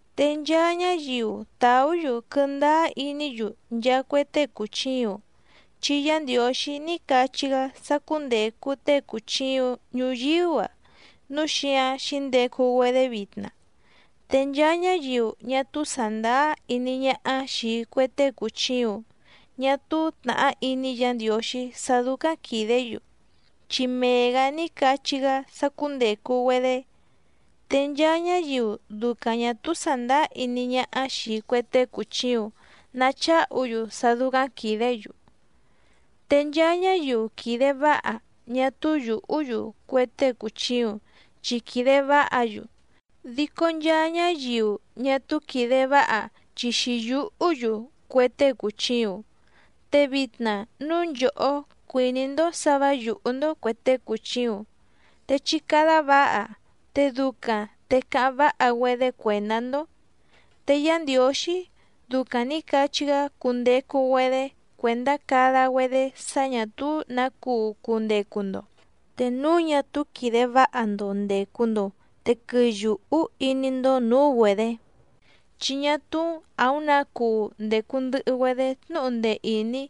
Te nchaa ñáyiu tàú‑yu quɨndáá iní‑yu nchaa cue tée cùchiuⁿ, chi Yá Ndiǒxí ní cachí‑gá sá cúndècu tée cùchiuⁿ ñuyíú‑a, núu xíǎⁿ xǐndecu‑güedé vitna. Te nchaa ñáyiu ñá túú sàndáá iní ñáhá xìi cue tée cùchiuⁿ ñá túú tnàhá iní Yǎ Ndiǒxí sá dúcáⁿ quìdé‑yu, chi mee‑gǎ ní cachí‑gá sá cúndècu‑güedé. Te nchaa ñáyiu ducaⁿ ñà túú sàndáá iní ñáhá xìi cue tée cùchiuⁿ nacháhu‑yu sá dúcáⁿ quìdé‑yu. Te nchaa ñáyiu quìde váha ñá túú yùhú‑yu cue tée cùchiuⁿ chi quìde váha‑yu, dico nchaa ñáyiu ñá túú quìde váha chi xǐyùhú‑yu cue tée cùchiuⁿ. Te vitna núu nchòhó cuìní‑ndó sǎ vǎ yùhú‑ndó cuè tée cùchiuⁿ te chí cádá vǎha, te ducaⁿ te cáháⁿ váha‑güedé cuèndá‑ndó. Te Yá Ndiǒxí ducaⁿ nǐ cachí‑gá cundecu‑güedé cuèndá cada‑güedé sá ñà túú nǎ cuu cundecu‑ndo, te núu ñá túú quìde váha‑ndo ndècu‑ndo te quɨyùhú iní‑ndó nǔú‑güedě, chi ñá túú àúⁿ nǎ cuu ndècu ndɨhɨ‑güedé tnúhu ndee ìní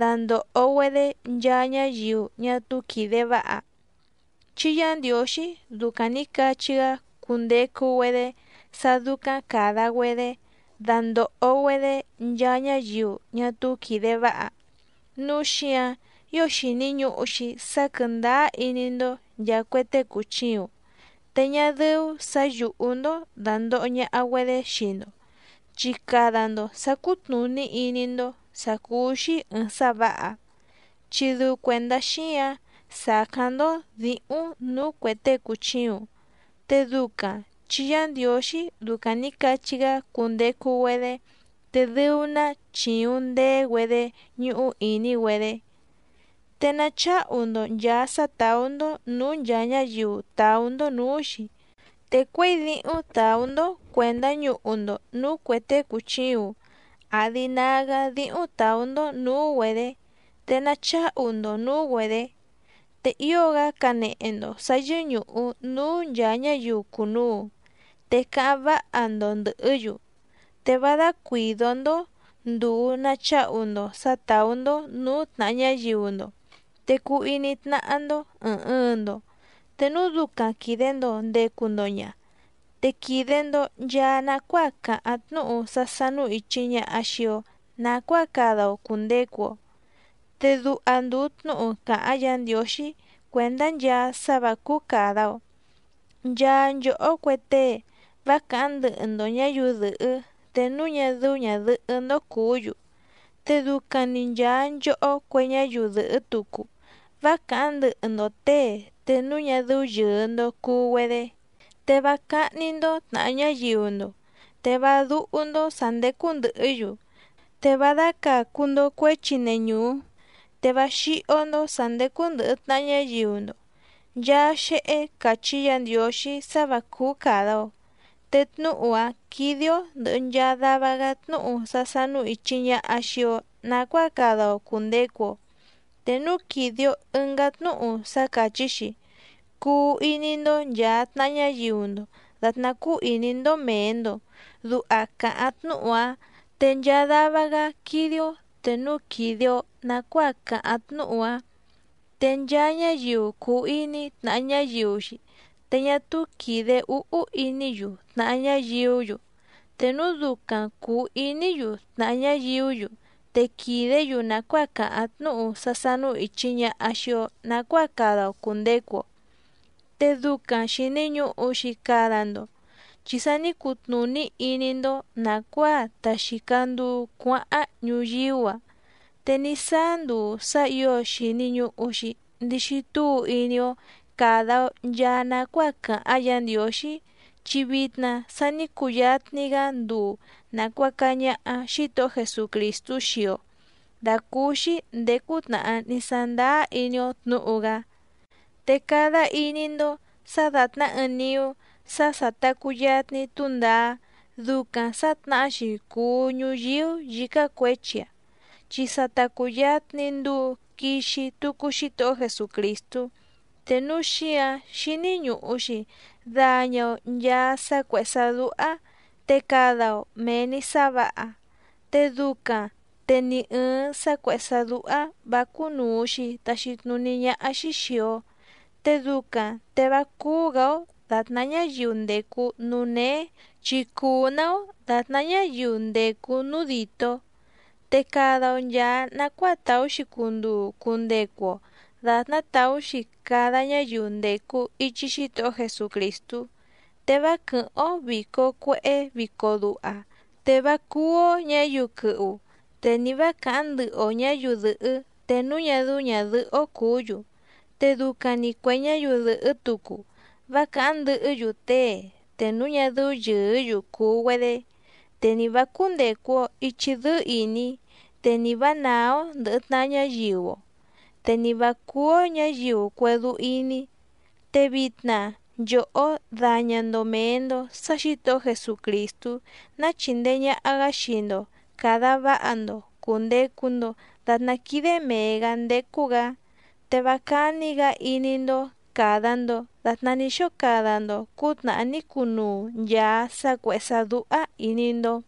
dandòho‑güedé nchaa ñáyiu ñá túú quìde váha, chi Yá Ndiǒxí ducaⁿ nǐ cachí‑gá cundecu‑güedé sá dúcáⁿ càda‑güedé dandòho‑güedé nchaa ñáyiu ñá túú quìde váha. Núu xíǎⁿ ío xìni ñuhu‑xi sá quɨ̀ndáá iní‑ndó nchàa cue tée cùchiuⁿ, te ñá dɨ́ú sǎ yùhú‑ndó dàndoho ñaha‑güedé xii‑ndo, chi cada‑ndo sǎ cútnùní iní‑ndó sǎ cúú‑xí ɨ̀ɨⁿ sá vǎha. Chi dɨu cuèndá xíǎⁿ sàcáⁿ‑ndó dǐhúⁿ nǔú cuè tée cùchiuⁿ, te ducaⁿ chi Yá Ndiǒxí ducaⁿ nǐ cachí‑gá cundecu‑güedé te dɨu‑ná chìuⁿ ndeé‑güedé ñúhú ìní‑güedé. Te nacháhu‑ndo nchàa sá tàú‑ndó nǔú nchàa ñáyiu tàú‑ndó nǔú‑xi, te cuěi díhúⁿ tàú‑ndó cuèndá ñuhu‑ndo nǔú cuè tée cùchiuⁿ àdi nágá díhúⁿ tàú‑ndó nǔú‑güedě te nacháhu‑ndo nǔú‑güedě. Te ío‑gá canehe‑ndo sǎ yɨ́ñùhu núú nchàa ñáyiu cùnuu, te cáháⁿ váha‑ndo ndɨ̀hɨ́‑yu. Te vá dácuìdó‑ndó ndùu nacháhu‑ndo sǎ tàú‑ndó nǔú tnàha ñáyiu‑ndo, te cuu iní tnáhá‑ndó ɨ̀ɨⁿ ɨɨⁿ‑ndo. Te núu ducaⁿ quìde‑ndo ndecu‑ndo ña, te quìde‑ndo nchaa nacuáa càháⁿ tnúhu sá sánú ìchi ñaha xii‑o nacuáa cada‑o cùndecu‑o. Te duha ndùu tnúhu càháⁿ Yǎ Ndiǒxí cuèndá nchaa sá vǎ cúú càda‑o: “Nchaa nchòhó cue tée vá càháⁿ ndɨhɨ‑ndo ñǎyiu dɨ̀hɨ́ te núu ñá dɨ́ú ñàdɨhɨ́‑ndó cùú‑yu, te ducaⁿ‑ni nchàa nchohó cue ñáyiu dɨ̀hɨ́ tucu vá càháⁿ ndɨhɨ‑ndo těe te núu ñá dɨ́ú yɨ̀ɨ‑ndo cuu‑güedé, te vá cáhní‑ndó tnàha ñáyiu‑ndo, te vá dúhú‑ndó sǎ ndécú ndɨ̀hɨ́‑yu, te vá dácàcu‑ndo cuéchi neñùú, te vá xíhó‑ndó sǎ ndécú ndɨ̀hɨ tnaha ñáyiu‑ndo”, nchaa xéhé càchí Yǎ Ndiǒxí sá vǎ cúú càda‑o. Te tnúhu‑a quìde‑o ndɨhɨ nchaa dava‑gá tnúhu sá sánú ìchi ñaha xii‑o nacuáa cada‑o cùndecu‑o, te núu quìde‑o ɨngá tnúhu sá càchí‑xi: “Cuu iní‑ndó nchàa tnaha ñáyiu‑ndo dàtná cúú ìní‑ndó mèe‑ndo”, duha càháⁿ tnúhu‑áⁿ. Te nchaa dava‑gá quídé‑ó te núu quìde‑o nacuáa càháⁿ tnúhu‑a. Te nchaa ñáyiu cùu iní tnàha ñáyiu‑xi te ñá túú quìde úhú iní‑yu tnàha ñáyiú‑yu, te núu ducaⁿ cùu iní‑yu tnàha ñáyiú‑yu te quìdé‑yu nàcuáa càháⁿ tnúhu sá sánú ìchi ñaha xii‑o nacuáa cada‑o cùndecu‑o. Te ducaⁿ xìni ñuhu‑xi cada‑ndo chi sa ní cutnùní iní‑ndó nàcuáa ta xìca nduu cuáháⁿ ñuyíú‑a, te ní sáá nduu sá ǐo xìni ñuhu‑xi ndixi túu iní‑ó càda‑o nchaa nacuáa càháⁿ Yǎ Ndiǒxí, chi vitna sa ní cuyatni‑gá nduu nàcuaca ñaha Xítohó Jesucrìstú xii‑o dàcúúxí ndèé cútnàhá ní sándáá iní‑ó tnǔhu‑gá. Te cada iní‑ndó sǎ dàtná ɨɨⁿ niú sá sà ta cuyatni túndaá, ducaⁿ sǎtnahá‑xi cùu ñuyíú yǐcá cuěchi‑a chi sa ta cùyatni nduu quixi tucu Xítohó Jesucrìstú, te núu xíǎⁿ xíní ñùhu‑xi daña‑o nchaa sá cuèhé sá dúhá te cada‑o mèe‑ni sá vǎha, te ducaⁿ te ni ɨ̀ɨⁿ sá cuèhé sá dúhá vǎ cúnùu‑xi taxi tnuní ñáhá‑xí xìi‑o, te ducaⁿ te vá cúú‑gǎ‑ó dàtná ñáyiu ndècu núú néé chi cuu‑ná‑ó dàtná ñáyiu ndècu núú dìtó. Te cada‑o nchàa nacuáa tàú‑xi cunduu cundecu‑o dàtná tàú‑xi cada ñáyiu ndècu ichi Xítohó Jesucrìstú, te vá quɨ̀hɨ́ⁿ‑ó vìco cuehé vico duha, te vá cúú‑ó ñǎyiu quɨhu, te ni vǎ càháⁿ ndɨhɨ‑o ñǎyiu dɨ̀hɨ́ te núu ñá dɨ́ú ñàdɨhɨ́‑ó cùú‑yu, te ducaⁿ‑ni cuè ñáyiu dɨ̀hɨ́ tucu vá càháⁿ ndɨhɨ́‑yu tée te núu ñá dɨ́ú yɨ̀ɨ́‑yu cùu‑güedé, te ni vǎ cúndècu‑o ichi dɨ́ɨ́ ìní, te ni vǎ nàá‑ó ndɨ̀hɨ tnaha ñáyiu‑o, te ni vǎ cúú‑ó ñǎyiu cuédú íní. Te vitna nchòhó daña‑ndo mèe‑ndo sá Xǐtohó Jesucrìstú ná chìndee ñaha‑gá xii‑ndo càda váha‑ndo cùndecu‑ndo datná quídé mèe‑gá ndécú‑gǎ, te vá cání‑gǎ iní‑ndó càda‑ndo datná ní xóo cada‑ndo cǔtnàhá ní cunuu nchàa sá cuèhé sá dúhá ìní‑ndó.